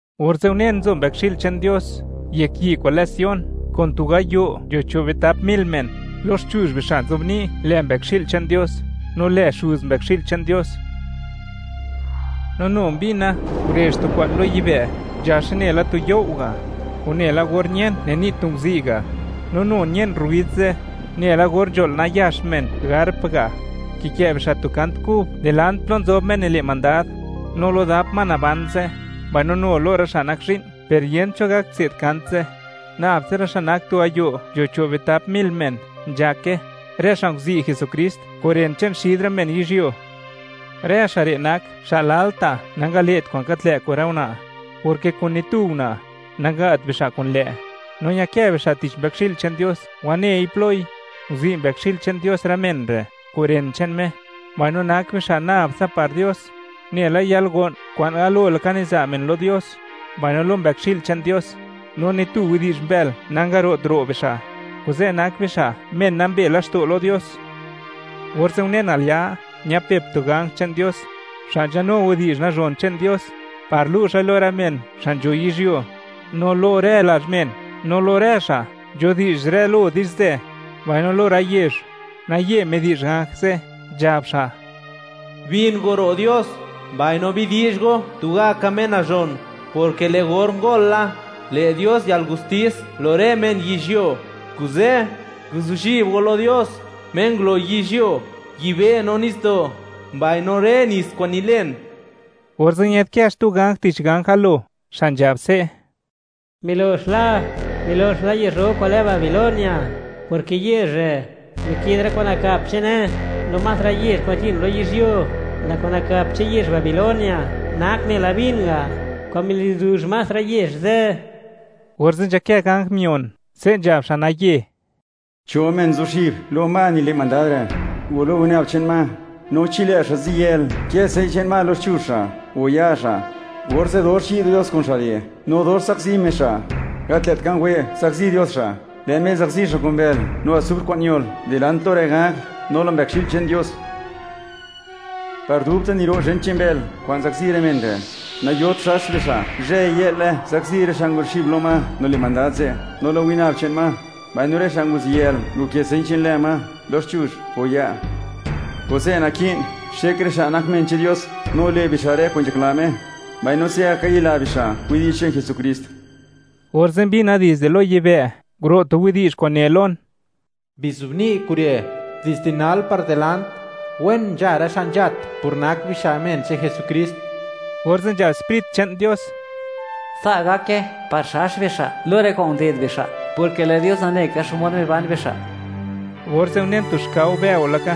Orze' unen nzo Mbëkxi'l che'n Dios, yek yi' kwa'n lë Sion, kun tu gayo' nzho cho' bitap mil men, loxchuzh bixa' nzobni' lë Mbëkxi'l che'n Dios, no lë Xuz Mbëkxi'l che'n Dios. No nu mbina, ngurezh tu kwa'n lo yibë', nzhaxe nela tu you' ga', o nela or ñen nini' tu nguzi' ga'; no nu ñën rruid ze', nela or nzho'l nayax men arp ga'. Kikë' bixa' tu kant kub dilant plo nzob Me nile' mandad, no lo dap ma naban ze', mbaino nu lo rë xa' nak zhi'n; per yent cho gak tse'd kant ze', nab tsa rë xa' nak tu gayo' nzho cho' bitap mil men nzhake, rë xa' nguzi' Jesukrist kun ren che'n xid rë men yizhyuo. Rë xa' re' nak xa' lalta' nangale't kwa'n gat lë' kun rë una', porke kun ni tu una', nanga't bixa' kun lë', no ñakë bixa' tich Mbëkxi'l che'n Dios wanei ploi. Nguzi' Mbëkxi'l che'n Dios rë men re' kun ren che'n Me, no nak bixa' nab tsa par Dios, nela yalgo'n kwa'n galo laka niza' men lo Dios, mbaino lo Mbëkxi'l che'n Dios. No ni tu widi'zh mbël nangaro't ro' bixa', kuze' nak bixa' men nambe laxto' lo Dios. Orze' unen, al ya' ñapep tu ganj che'n Dios, xa' nzhanu widi'zh nazhon che'n Dios, par lu' xa'i lo rë men xa' nzho yizhyuo, no lo rë lazh men, no lo rë xa' nzhudi'zh rë lo di'zhzë, mbaino lo rë yezh; naye midi'zh ganj ze', nzhab xa': ―¡Bin go ro' Dios, mbaino bidi'zh go tugaka Me nazhon!, porke lë' or ngol la, le' Dios yalgustis lo rë men yizhyuo, kuze' guzuxib go lo Dios Me ngulo yizhyuo, yibë', no nitsdo', mbaino rë nits kwa'n nilen. Orze' ñë'dkë xtu ganj tich ganj galo, xa' nzhab se': ―¡Milox la, milox la yezh ro kwa'n lë Babilonia!, porke yezh re' mike'd rë kwa'n nakap che'ne lo más rë yezh kwa'n nzhin lo yizhyuo; lë' kwa'n nakap che'n yezh Babilonia nak nela vin ga' kwa'n milizuzh más rë yezh ze'. Orze' nzhakë ganj mion, se' nzhab xa' naye: ―Cho men zuxib lo ma nile' mandad re', o lo winab che'n ma, no chi lë' xa' ziyël, kë señ che'n ma loxchuzh xa', o ya' xa', orze' dox yi' Dios kun xa' re' no dox zakzi Me xa'; gat lë't ka wë' zakzi Dios xa'; lë' Me zakzi xa' kun bël no asufr kwa'n ñol, dilant lo rë ganj no lo Mbëkxi'l che'n Dios. Par dubta' niro' zhen che'n bël kwa'n zakzi rë men re'; nayot xax bixa'; zhëy-yë'le zakzi rë xa' nguzuxib lo ma nile' mandad ze' no lo winab che'n ma, mbaino rë xa' nguziyël nkë señ che'n lë ma loxchuzh xa' mbaino ya' xa'. Kuze' naki'n xek rë xa' nak men che'n Dios no nile' bixa' rë kwa'n nzhakla Me, mbaino se'gaka ñila bixa' widi'zh che'n Jesukrist. Orze' mbina dizde lo yibë', nguro' tu widi'zh kwa'n ne lon: ―Bizobni' kure': “Dizde nal par dilant, wen nzha rë xa' nzhat por nak bixa' men che'n Jesukrist.” Orze' nzhab Sprit che'n Dios: ―Sa' gake, par xax bixa' lo rë kwa'n nded bixa', porke lë' Dios nane ka xmod miban bixa'. Orze' unen tu xkao bëo laka,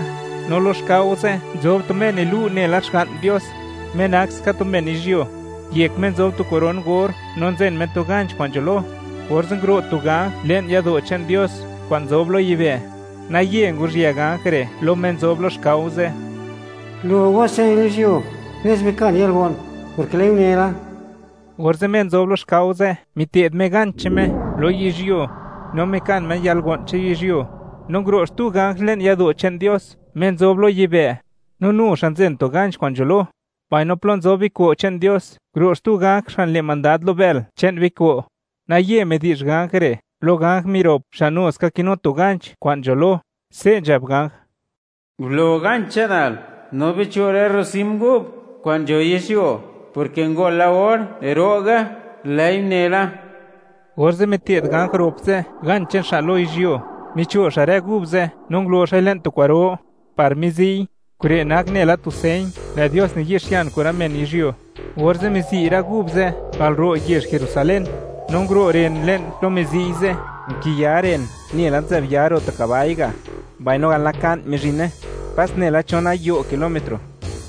no lo xkao ze' nzob tu Me nilu' nela Xga'n Dios, Me nak ska tu men yizhyuo; yek Me nzob tu koron gor no nzen Me tu ganch kwa'n nzho lo, orze' nguro' tu ganj le'n yado' che'n Dios kwa'n nzob lo yibë', naye nguruzhië ganj re' lo Me nzob lo xkao ze': ―Gulo ganch che'nal yizhyuo nes bikan yalgo'n, porke lë'i une la. Orze', Me nzob lo xkao ze', mite'd Me ganch che'n Me lo yizhyuo, no mikan Me yalgo'n che'n yizhyuo, no nguro' xtu ganj le'n yado' che'n Dios Me nzob lo yibë', no nu xa' nzen tu ganch kwa'n nzho lo, mbaino plo nzob biko' che'n Dios, nguro' xtu ganj xa' nile' mandad lo bël che'n biko', naye midi'zh ganj re' lo ganj mirop xa' nu ska kinu tu ganch kwa'n nzho lo, se' nzhab ganj: ―Gulo ganch che'nal no bicho' rë rrocim gub kwa'n nzho yizhyuo, porke ngol la or ro'ge, lë'i une la. Orze' mite'd ganj rop ze' ganch che'n xa' lo yizhyuo, micho' xa' rë gub ze', no ngulo xa'i le'n tu kwa'ro, par mizi'y; kure' nak nela tu señ lë' Dios niyi'xian kun rë men yizhyuo. Orze' mizi' rë gub ze' al ro' yezh Jerusalén, no nguro' ren le'n plo mizi'y ze', nkiya ren nela nzë'b ya ro' tu kabai ga', mbaino al naka'n mizhine, pas nela chon gayo' kilómetro.